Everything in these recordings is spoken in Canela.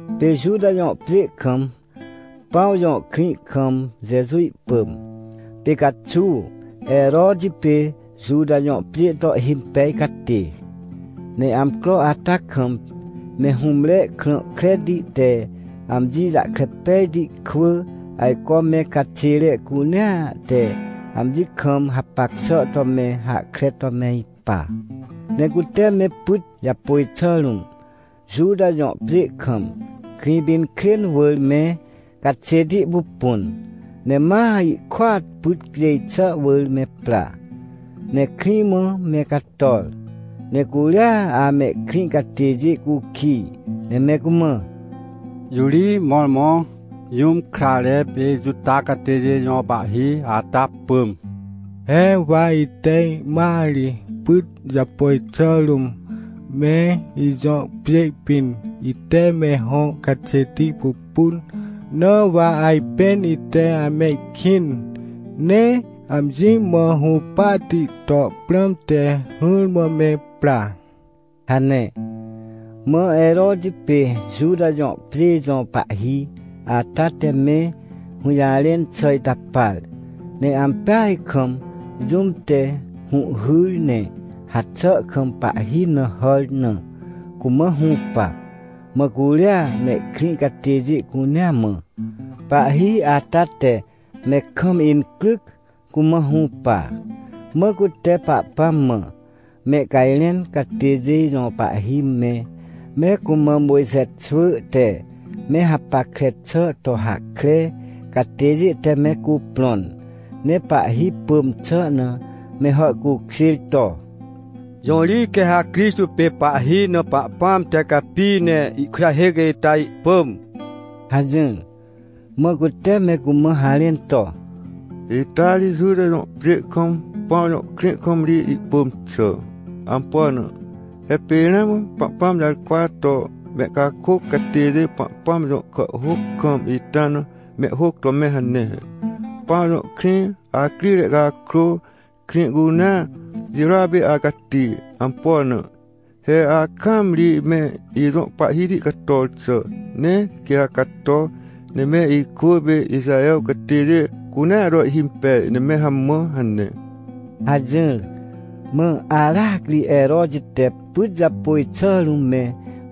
Pê Juta jõ pjê kam, Pãw jõ krĩ kam Jeju ihpỳm. Pê caxuaw Heroti pê Juta jõ pjê to ihhimpej catê. Ne amcro ata kam me hũmre krã kreti te amji jahkre pejti kwỳ ajco me caxêre cunea te amji kam hapac xà to me hahkre to me ipa. Ne cute me pyt japôj xà rũm, Juta jõ pjê kam, Krĩpinkrên wỳr me caxêti pupun, ne ma ihkôat pyt cjêj xà wỳr me pra. Ne krĩ mã me cator. Ne curia amehkrĩ catêjê cukij ne me cumã: — Jõ ri mõrmõ jũm krare pê Juta catêjê jõ pahhi ata pỳm? He wa ite ihmat ri pyt japôj xà rũm, me ijõ pjê pĩn, ite me hõ caxêti pupun, na wa ajpên ite amehkĩn, ne amji mã hũpahti to prãmte hỹrmã me pra — hane. Mã Heroti pê Juta jõ pjê jõ pahhi ata te me hũjarẽn xà ita par, ne ampeaj kam, jũm te hũhhyr ne haxà kam pahhi na hàr na, cumã hũpa. Mã curia mehkrĩ catêjê cunea mã, pahhi ata te me kam incryc cumã hũpa. Mã cute Pahpãm mã mehcajrẽn catêjê jõ pahhi me, me cumã Mojxe xwỳ te me hapackre xà to hahkre catêjê te me cuprõn, ne pahhi pỳm xà na me hàhcukjêr to: — Jõ ri quê ha Crixtô pê pahhi na Pahpãm te capi ne ihkujahêc ita ihpỳm? — hajỹr. Mã cute me cumã harẽn to: — Ita ri Juta jõ pjê kam, Pãw jõ krĩ kam ri ihpỳm xà. Ampo na? He pê ramã Pahpãm jarkwa to mehcakôc catêjê Pahpãm jõ kàhhôc kam ita na mehhôc to me hane he: “Pãw jõ krĩ, acrire cakrô, krĩ cunea jirôa pê acati. Ampo na? He akaam ri me ijõ Pahhiti cator xà. Ne quê ha cato, ne me ikwỳ pê Ixaher catêjê cunea to ihhimpej, ne me hamã” hane — hajỹr. Mã aracri Heroti te pyt japôj xà rũm me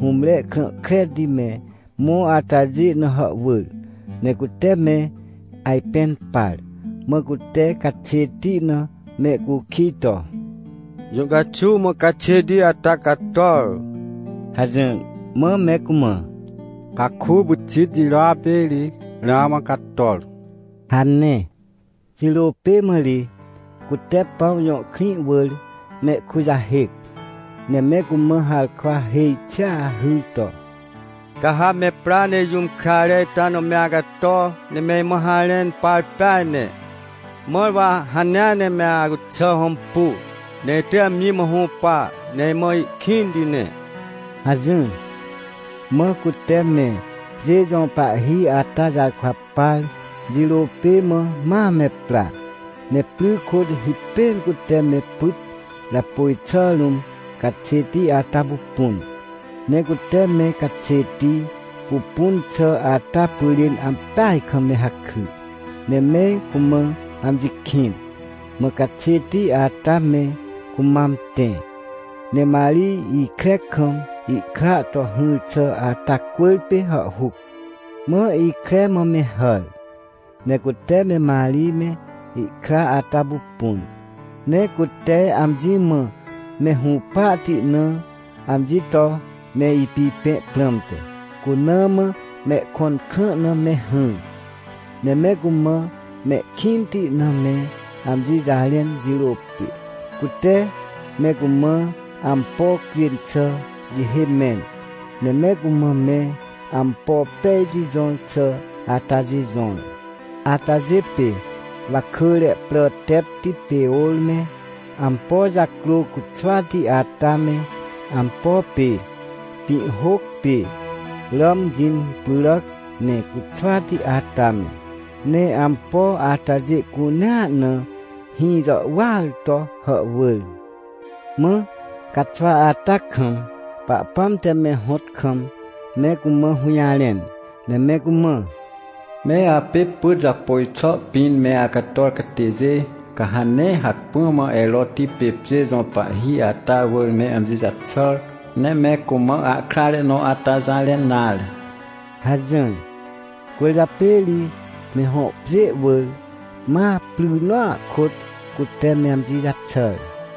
hũmre krã kreti me mõ atajê na hàhwỳr, ne cute me ajpẽn par, mã cute caxêti na mehcukij to: — Jũ caxuw mã caxêti ata cator? — hajỹr. Mã me cumã: — Caku pyxit jirôa pê ri ramã cator — hane. Jirô pê mã ri cute Pãw jõ krĩ wỳr mehkujahêc, ne me cumã harkwa hêj xia hyr to: — Ca ha me pra ne jũm krare ita na me acato, ne me imã harẽn par peaj ne. Mãr wa hanea ne me acuxà hõmpu, ne itỳj amji mã hũpa, ne imã ihkĩnti ne — hajỹr. Mã cute me pjê jõ pahhi ata jarkwa par jirô pê mã ma me pra, ne pry kôt hipêr cute me pyt japôj xà rũm caxêti ata pupun. Ne cute me caxêti pupun xà ata pyrên ampeaj kam me hakry, ne me cumã amji kĩn. Mã caxêti ata me cumam tẽ, ne Marij ikre kam ihkra to hỹr xà ata cwỳrpê hàhhuc. Mã ikre mã me hàr, ne cute me Marij me ihkra ata pupun, ne cute amji mã me hũpahti na amji to me ipipẽ prãmte, cuna mã mehkõn krã na me hỹr. Ne me cumã mehkĩnti na me amji jarẽn jirô pê, cute me cumã ampo cjên xà jihê mẽn, ne me cumã me ampo pejti jõr xà atajê jõr. Atajê pê wakỳre prà tepti pê ôr me, ampo jacrô cuxwati ata me, ampo pê pĩhhôc pê ràm jĩn pyràc, ne cuxwati ata me. Ne ampo atajê cunea na hĩ jàhwỳar to hàhwỳr. Mã caxwa ata kam Pahpãm te me hõt kam me cumã hũjarẽn, ne me cumã: — Me apê pyt japôj xà pĩn me acator catêjê, ca ha nee hacpỹ mã Heroti pê pjê jõ pahhi ata wỳr me amji jaxàr, ne me cumã ahkrare nõ ata jarẽn nare — hajỹr. Cwỳrjapê ri me hõ pjê wỳr, ma pry nõa kôt, cute me amji jaxàr.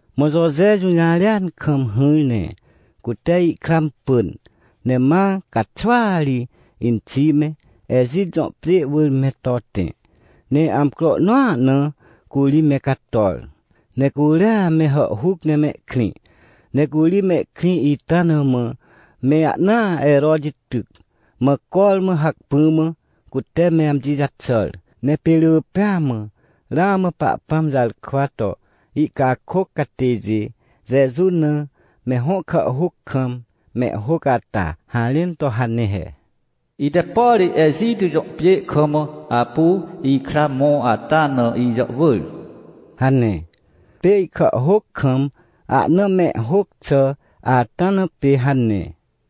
Mã Joje jũjarêan kam hỹr ne cute ihkra impỳn, ne ma caxwaa ri inxi me, Ejit jõ pjê wỳr me to tẽ, ne amcro nõa na curi me cator. Ne curia me hàhhuc ne mehkrĩ, ne curi mehkrĩ ita na mã me ahnaa Heroti tyc, mã cormã hacpỹ mã, cute me amji jaxàr. Ne pê rỳ pêa mã ramã Pahpãm jarkwa to ihcakôc catêjê Jeju na, me hõ kàhhôc kam, mehhôc ata harẽn to hane he: “Ite, por Ejit jõ pjê kam apu ikra mõ ata na, ijàhwỳr” hane. Pê ihkàhhôc kam ahna mehhôc xà ata na pê hane.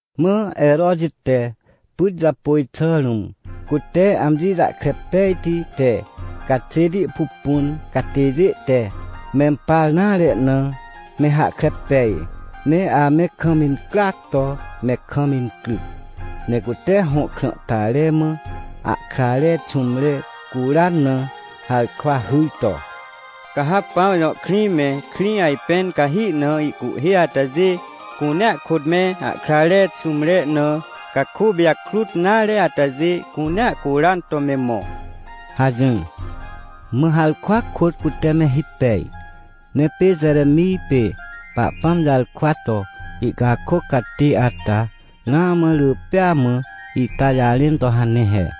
Mã Heroti te pyt japôj xà rũm cute amji jahkre pejti te caxêti pupun catêjê te mempar nare na, me hahkre pej, ne ame kam incryac to me kam incryc. Ne cute hõ krãhtare mã ahkrare xũmre curan na harkwa hyr to: — Ca ha Pãw jõ krĩ me, krĩ ajpẽn cahi na ihcuhhê atajê cunea kôt me ahkrare xũmre na caku pijakrut nare atajê cunea curan to me mõ — hajỹr. Mã harkwa kôt cute me hipej. Ne pê Jeremij pê Pahpãm jarkwa to ihcakôc catê ata ramã rỳ pea mã ita jarẽn to hane he: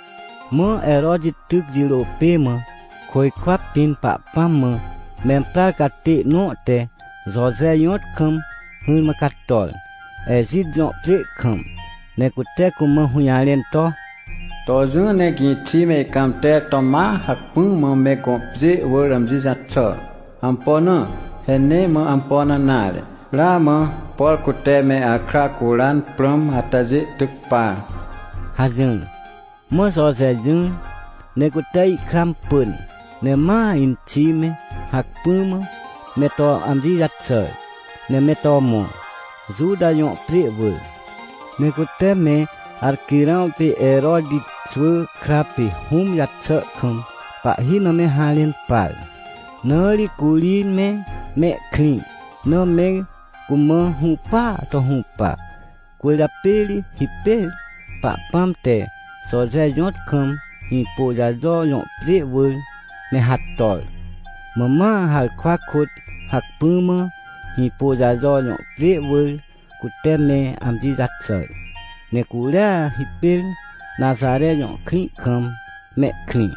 Mã Heroti tyc jirô pê mã, côjkwa pĩn Pahpãm mã memprar catê nõ te Joje jõt kam hỹrmã cator, Ejit jõ pjê kam, ne cute cumã hũjarẽn to: — To jỹ ne gĩxi me ihcãmter to ma hacpỹ mã me gõ pjê wỳr amji jaxà. Ampo na? He nee mã ampo na nare, ramã, por cute me akra curan prãm atajê tyc par — hajỹr. Mã Joje jỹr, ne cute ihkra impỳn, ne ma inxi me, hacpỹ mã me to amji jaxàr, ne me to mõ, Juta jõ pjê wỳr. Ne cute me Arquirãw pê Heroti xwỳ kra pê hũm jaxà kam pahhi na me harẽn par. Na ri curi me mehkrĩ na me cumã hũpaa to hũpa. Cwỳrjapê ri hipêr Pahpãm te Joje jõt kam Hĩpôjajo jõ pjê wỳr me hator. Mã ma harkwa kôt hacpỹ mã Hĩpôjajo jõ pjê wỳr cute me amji jaxàr. Ne curia hipêr Naxare jõ krĩ kam mehkrĩ.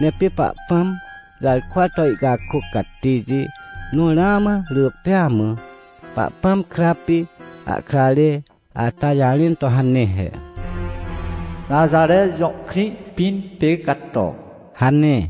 Ne pê Pahpãm jarkwa to ihcakôc catêjê nõ ramã rỳ pêa mã Pahpãm kra pê ahkrare ata jarẽn to hane he: “Naxare jõ krĩ pĩn pê cato” hane.